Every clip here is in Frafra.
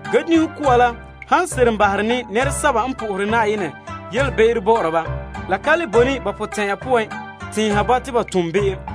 Ge dunhe koa la han seren duhuru ne nɛresɛba la be'em, ba me kan le koora ko'sɛka woo te ba koora la. Se'ere n sɔe la ka le boe ne ba potɛn'ɛra poan tɛɛnha ba te ba tom be'em.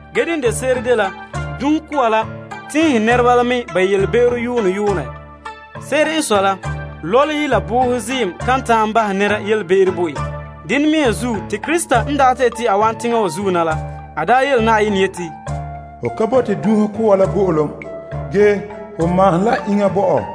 Ge dene de se'ere dela dunhe koa la tɛɛnhe nɛreba la mɛ ba yelebe'ero yuunɛ yuunɛ. Se'ere n sɔe la, lɔlehe la boohe ziim kan ta'an bahɛ nɛra be'em bo en. Dene mea zuo, te Krista n daa ta yeti a wa'an teŋa wa zuo na la, a daa yeti, Hom ka bote kaanbegɔ la bo'olom, ge ho maahom la iŋa bo mam.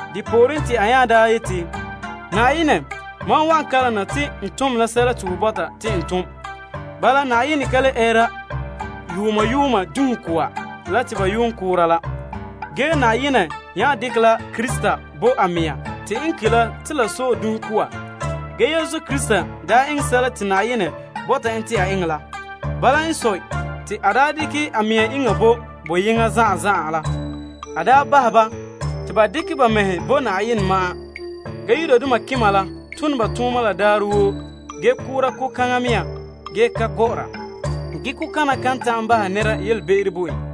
Te a nya daa yele te, mam n wana, mam wan tom ho sunboolom la. Bala, Na'ayenɛ ka le ɛɛra yuuma yuuma dunhe koa la te ba yuun da koora la ge nya dekɛ la Krista n bo a mɛŋa te n ki' la te la sɔe dunhe koa. Yesu Krista daa eŋɛ Na'ayenɛ sunboolom la, dekɛ a mɛŋa iŋa bo boyena zan'an, bahɛ te to de Na'ayenɛ toolom nɛreba. Yudoma malema daandoma woo la tone ba tooma la daarɛ woo ge koora ko'kaŋa mea ge ka gɔ'ɔra. Ge ko'kana kan ta'an bahɛ nɛra be'em bo en.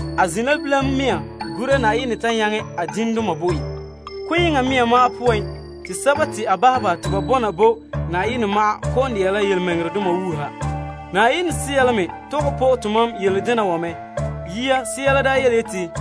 A zin' la bilam mea gura Na'ayenɛ ta nyaŋɛ a diŋdoma bo en. Ko'yeŋɔ mea ma'an poan te sɛba te a bahɛ ba dɛna Na'ayenɛ toolom nɛreba kɔ'ɔn dɛna la yelemɛŋɛrɛdoma wuuha. Na'ayenɛ Sea la me tɔgɛ po'e tomam yele dena wa mɛ. Yia, Sea la daa yeti,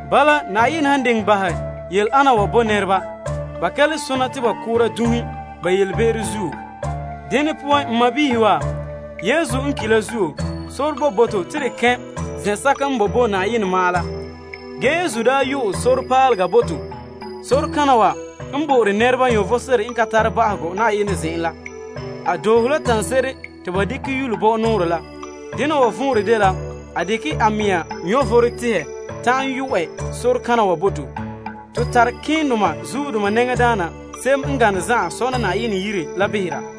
Bala, Na'ayenɛ han diŋɛ bahɛ ba be'em wa bo nɛreba, ba ka le sona te ba ko' dunhe ba be'em zuo. Dene poan, n sɔɔnrɔ wa, Yesu n ki' la zuo, sore boe bo to te to kɛn' toolom zen'an la poan. Ge Yesu nya yu'ɛ sore paalega bo to bo'ore nɛreba vom n ka tare ba'ahegɔ la. A doohe la tanse'ere te ba dekɛ yule bɔ'ɔ nɔɔrɛ la. Dena wa vɔnrɛ dela a dekɛ la a mɛŋa vom tihɛ ta'an yɔ'ɛ sore kana wa bo to. Ton tare malemadaana n gane zan'an sɔna Na'ayenɛ yire la behera,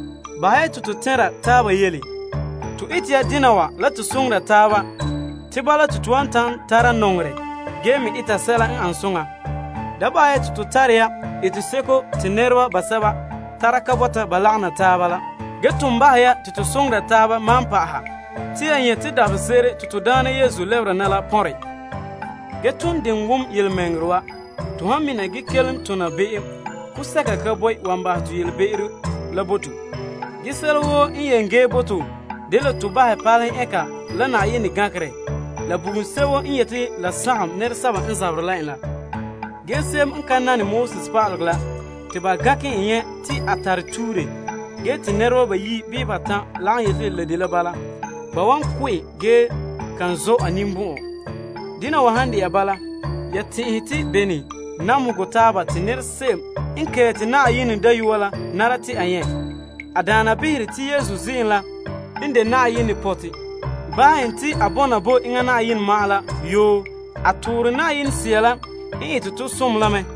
Bahɛ ya te to tɛnra taaba yele, ete dena wa la to soŋora taaba, tara nɔŋerɛ ge me eta sɛla n an soŋa. Da bahɛ te to tare ya eteseko te nɛreba basɛba tara ka bɔta ba lagom na la taaba la, ge ton bahɛ ya te to soŋora taaba maan pa'aha te ya nyɛ' te dabahese'ere te to Daana Yesu lɛbera na la pɔnre. Ton diŋɛ wom yelemɛŋɛrɛ wo to han mina ge kelom tona be'em, kaanbegɔ seko ka boe n wan bahɛ to yelebe'ero la bo to. Ge sɛla gee bo to dela to palehe ɛngera la Na'ayenɛ gankerɛ, la bugum sebo n yeti la sagom nɛresɛba n zaberɛ la en la. Ge se'em n ka nane Moses pa'alegɔ te ba gankɛ nyɛ' en te a tara tuure ge te nɛreba bayi' bii batan' lagom yeti la dela bala, ba wan ko' en ge kan zɔ' en ninbɔn'ɔn. Dena wa han de'a bala, ya tɛn'ɛhe te bene namehegɔ taaba te nɛra se'em n kɛɛte Na'ayenɛ Dayɔa la nara ta a nyɛ'? A daana behere te Yesu ziim la n de Na'ayenɛ pɔtɛ bahɛ en te a dɛna Na'ayenɛ toolom nɛra la yoo. A toore Na'ayenɛ Sea la n ete tɔ som la mɛ.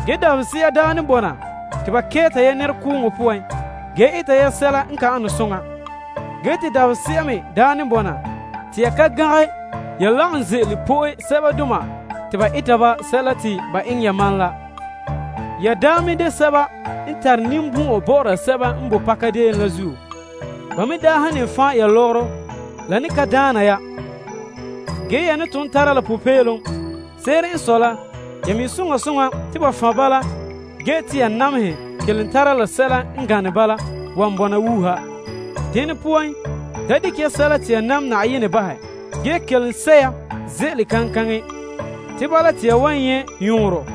Dabahese'a daa ne bɔna te ba kɛɛta ya nɛrekooŋɔ poan ge eta ya sɛla n ka ane soŋa. Te dabahese'a me daa ne bɔna te ya ka gangɛ ya lagom ze'ele po'e sɛbadoma me te ba eta ba sɛla te ba eŋɛ yamam la. Ya daa me de sɛba n tare ninbɔn'ɔn bɔ'ɔra sɛba n boe pakadeen la zuo. Ba me daa han ne fan' ya lɔgɔrɔ, la ne ka daana ya, ge ya ne ton tara la popeelom. Se'ere n sɔe la, ya mi' te ya tara la sɛla n gane bala wan bɔna wuuha. Dene poan, da dekɛ ya sɛla te ya nam Na'ayenɛ bahɛ ge kelom sɛ' ya ze'ele kaŋkaŋɛ. Te bala te ya wan nyɛ' yɔɔrɔ.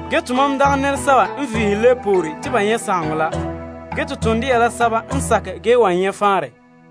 Ge tomam dagɛ nɛresɛba n vihe lebe poore bɔrege ge to ton dɛna la sɛba n sakɛ ge wan nyɛ' faanrɛ.